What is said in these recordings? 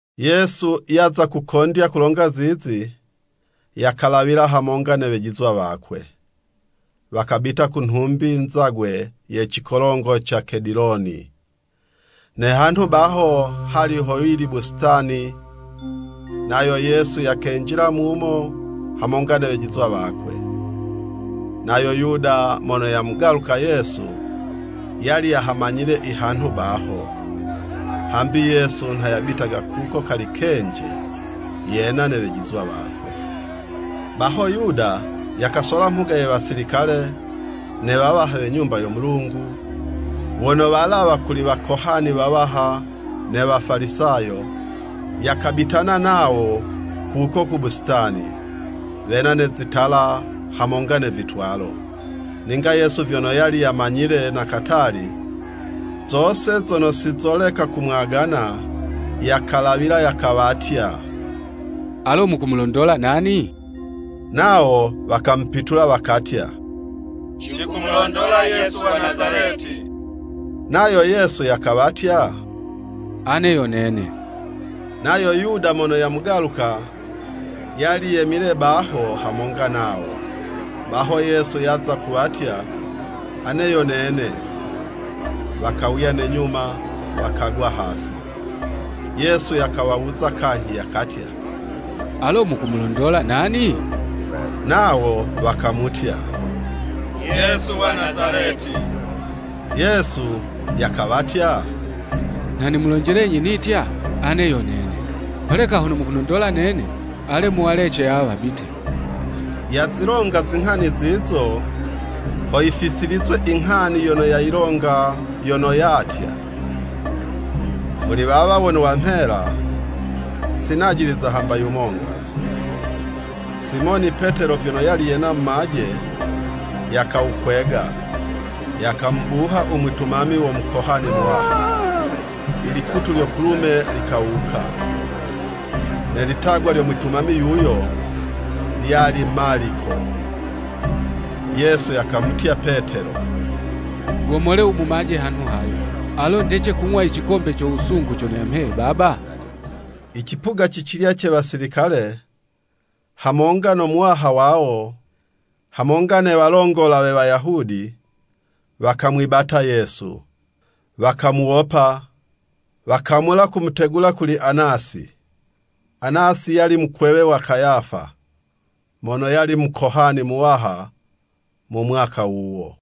Yesu yaza kukondya kulonga zizi, yakalawila hamonga ne wejizwa wakwe, wakabita ku nhumbi nzagwe ye cikolongo ca Kediloni. Ne hanhu baho hali ho yili busitani, nayo Yesu yakenjila mumo hamonga ne wejizwa wakwe. Nayo Yuda mono yamugaluka Yesu, yali yahamanyile ihanhu baho, hambi Yesu nha yabitaga kuko kali kenji, yena ne wejizwa wakwe. Baho Yuda yakasola mhuga ye Wasilikale, ne wawaha we Nyumba yo Mulungu, wono walawa kuli Wakohani wawaha ne Wafalisayo, yakabitana nawo kuko ku busitani, wena ne zitala hamonga ne vitwalo. Ninga Yesu vyono yali yamanyile na katali, zose zono sizoleka kumwagana, yakalawila, yakawatya, “Alo mukumulondola nani?” Nawo wakamupitula wakatya, “Cikumulondola Yesu wa Nazaleti.” Nayo Yesu yakawatya, “Ane yo Nene.” Nayo Yuda mono yamugaluka, yali yemile baho hamonga nawo. Baho Yesu yaza kuwatya, “Ane yo Nene.” Wakawuya ne nyuma wakagwa hasi. Yesu yakawawuza kanyhi, yakatya, “Alo mukumulondola nani?” Nawo wakamutya, “Yesu wa Nazaleti.” Yesu yakawatya, “Nha nimulonjelenyi nitya, ‘Ane yo nene.’ Holeka hono mukunondola nene, ale muwalece awa wabite.” ( Yazilonga zinghani zizo, ho yifisilizwe inghani yono yayilonga, yono yatya, “Muli wawa wono wamhela, si najiliza hamba yumonga.”) Simoni Petelo vyono yali yena mumaje, yakawukwega, yakamubuha umwitumami wo Mukohani muwaha, ilikutu lyo kulume likawuka. Ne litagwa lyo mwitumami yuyo, lyali Maliko. Yesu yakamutya Petelo, “Gomole umumaje hanhu hayo. Alo ndece kung'wa i cikombe co wusungu, cono yamheye Baba?” Icipuga cicilya ce Wasilikale, hamonga no muwaha wawo, hamonga ne walongola we Wayahudi, wakamwibata Yesu, wakamuwopa, wakamula kumutegula kuli Anasi. Anasi yali mukwewe wa Kayafa mono yali mukohani muwaha mu mwaka wuwo.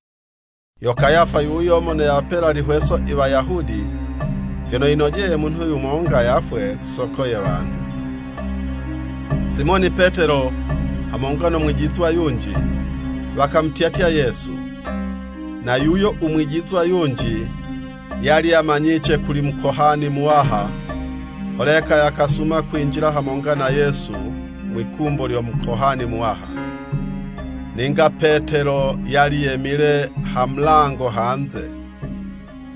Yo Kayafa yuyo mono yawapela ilihweso Iwayahudi, vyono, yinojeye munhu yumonga yafwe ku soko ye wanhu. Simoni Petelo, hamonga no mwijizwa yunji, wakamutyatya Yesu. Na yuyo u mwijizwa yunji, yali yamanyice kuli Mukohani muwaha. Holeka yakasuma kwinjila hamonga na Yesu mwikumbo lyo Mukohani muwaha. Ninga Petelo yali yemile ha mulango hanze.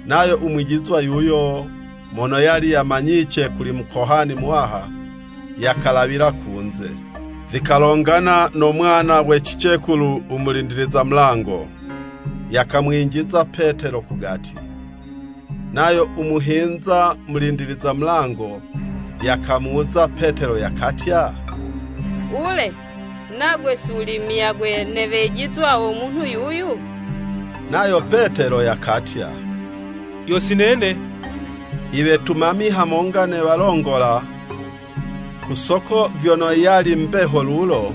Nayo u mwijizwa yuyo mono yali yamanyice kuli Mukohani muwaha, yakalawila kunze, vikalongana no mwana we cicekulu u mulindiliza mulango, yakamwinjiza Petelo kugati. Nayo u muhinza mulindiliza mulango, yakamuwuza Petelo yakatya, “Wule, nagwe si wuli muyagwe ne wejizwa wo munhu yuyu?” Nayo Petelo yakatya, “Yo si nene.” Iwetumami hamonga ne walongola, ku soko vyono yali mbeho lulo,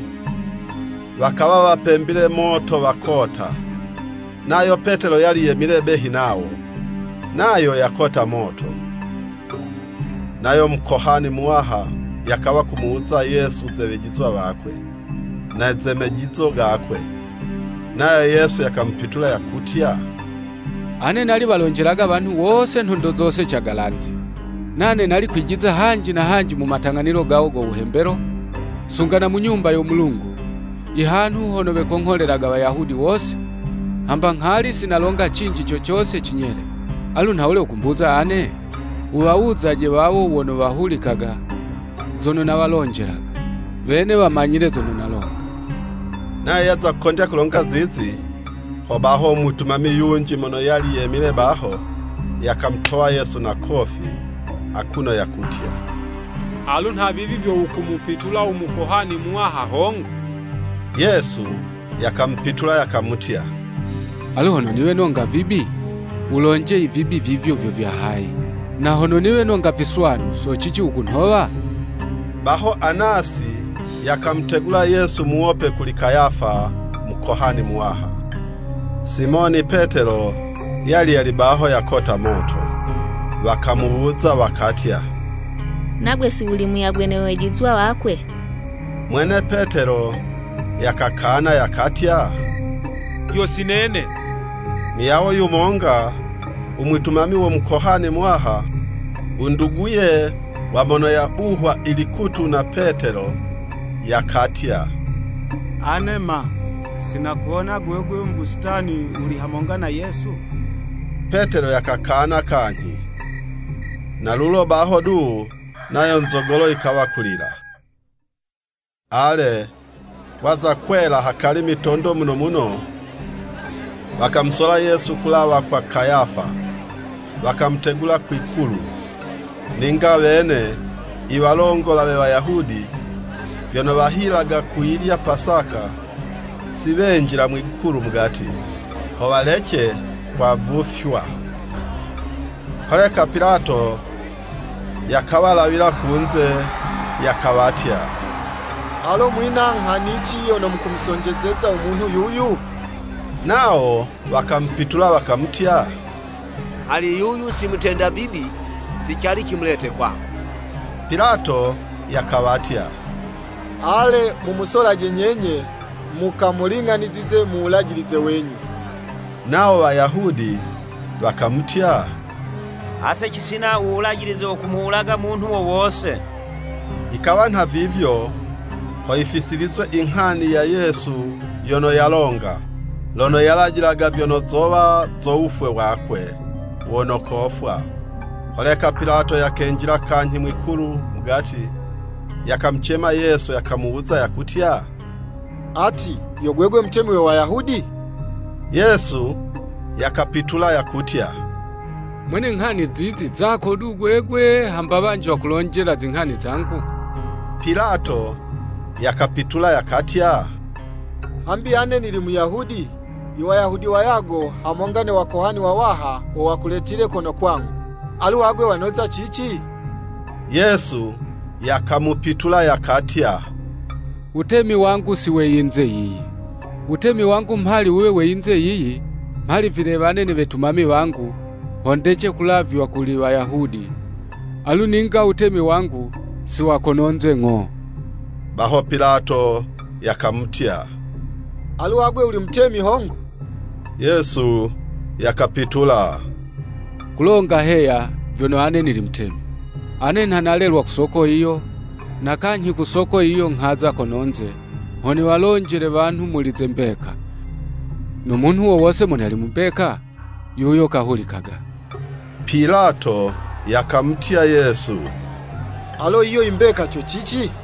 wakawa wapembile moto wakota. Nayo Petelo yali yemile behi nawo, nayo yakota moto. Nayo Mukohani muwaha yakawa kumuwuza Yesu ze wejizwa wakwe, na ze mejizo gakwe. Nayo Yesu yakamupitula yakutya, “Ane nali walonjelaga wanhu wose nhondo zose cagalanze. Nane nali kwijiza hanji na hanji mu matang'anilo gawo go wuhembelo, sunga na mu Nyumba yo Mulungu, ihanhu hono wekongholelaga Wayahudi wose, hamba nghali si nalonga cinji co cose cinyele. Alu nhawule wukumbuza ane? Wuwawuzaje wawo wono wahulikaga, zono nawalonjelaga. Wene wamanyile zono nalonga.” Nayo yaza kukondya kulonga zizi, hobaho umwitumami yunji mono yali yemile baho, yakamutowa Yesu na kofi, akuno yakutya, “Alu nhavivi vyo wukumupitula u Mukohani muwaha hongo?” Yesu yakamupitula yakamutya, “Alu hono niwe nonga vibi, wulonje i vibi vivyo vyo vya hayi, na hono niwe nonga viswanu, socici wukunhowa?” Baho, Anasi yakamutegula Yesu muwope kuli Kayafa Mukohani muwaha. Simoni Petelo yali yali baho yakota moto. Wakamuwuza wakatya, “Nagwe si wuli muyagwe ne wejizwa wakwe?” Mwene Petelo yakakana yakatya, “Yo si nene.” Muyawo yumonga, u mwitumami wo Mukohani muwaha, u nduguye wa mono yabuhwa ilikutu na Petelo, yakatya, “Ane ma, si nakuwona gwegwe mu busitani wuli hamonga na Yesu?” Petelo yakakana kanyhi, na lulo baho du, nayo nzogolo yikawa kulila. Ale, waza kwela hakali mitondo muno muno, wakamusola Yesu kulawa kwa Kayafa, wakamutegula kwi'kulu. Ninga wene i walongola we Wayahudi, vyono wahilaga kuyilya Pasaka, si wenjila mwi'kulu mugati, ho walece kwavufywa. Holeka Pilato yakawalawila kunze, yakawatya, “Alo mwina nghanici yono mukumusonjezeza u munhu yuyu?” Nawo wakamupitula wakamutya, “Mhali yuyu si mutenda vibi, si cali cimulete kwako.” Pilato yakawatya, “Ale mumusolaje nyenye, mukamuling'anizize mu Wulajilize wenyu.” Nawo Wayahudi wakamutya, “Ase cisina u Wulajilize wo kumuwulaga munhu wo wose.” ( Yikawa nha vivyo, ho yifisilizwe inghani ya Yesu yono yalonga, lono yalajilaga vyono zowa zo wufwe wakwe wono kofwa.) Holeka Pilato yakenjila kanyhi mwi'kulu mugati, yakamucema Yesu yakamuwuza, yakutya, “Ati, yo gwegwe mutemi we Wayahudi?” Yesu yakapitula yakutya, “Mwene nghani zizi zako du gwegwe, hamba wanji wakulonjela zinghani zangu?” Pilato yakapitula yakatya, “Hambi ane nili Muyahudi?” Iwayahudi wayago hamonga ne Wakohani wawaha, wo wakuletile kono kwangu. Alu agwe wanoza cici? Yesu yakamupitula yakatya, “Wutemi wangu si we yinze yiyi. Wutemi wangu mhali wuwe we yinze yiyi, mhali vilewane ne wetumami wangu, ho ndece kulavywa kuli Wayahudi, alu ninga wutemi wangu si wa kononze ng'o.” Baho Pilato yakamutya, “Alu agwe wuli mutemi hongo?” Yesu yakapitula, “Kulonga heya, vyono ane nili mutemi. Ane nha nalelwa ku soko yiyo, na kanyhi ku soko yiyo nghaza kononze, ho niwalonjele wanhu muli ze mbeka. No munhu wo wose mono yali mu mbeka, yuyo kahulikaga.” Pilato yakamutya Yesu, “Alo yiyo imbeka co cici?”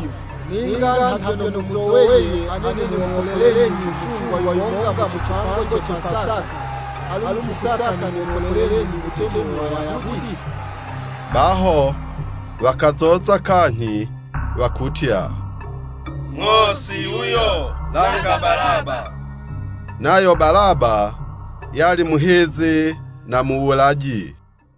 Ninga nha vyono muzoweye ane nimuwopolelenyi mufungwa yumonga mu cipango ce Pasaka. Alu mukusaka nimuwopolelenyi u Mutemi we Wayahudi? Baho wakazoza kanyhi wakutya, “Ng'o si yuyo, langa Balaba.” Nayo Balaba yali muhizi na muwulaji.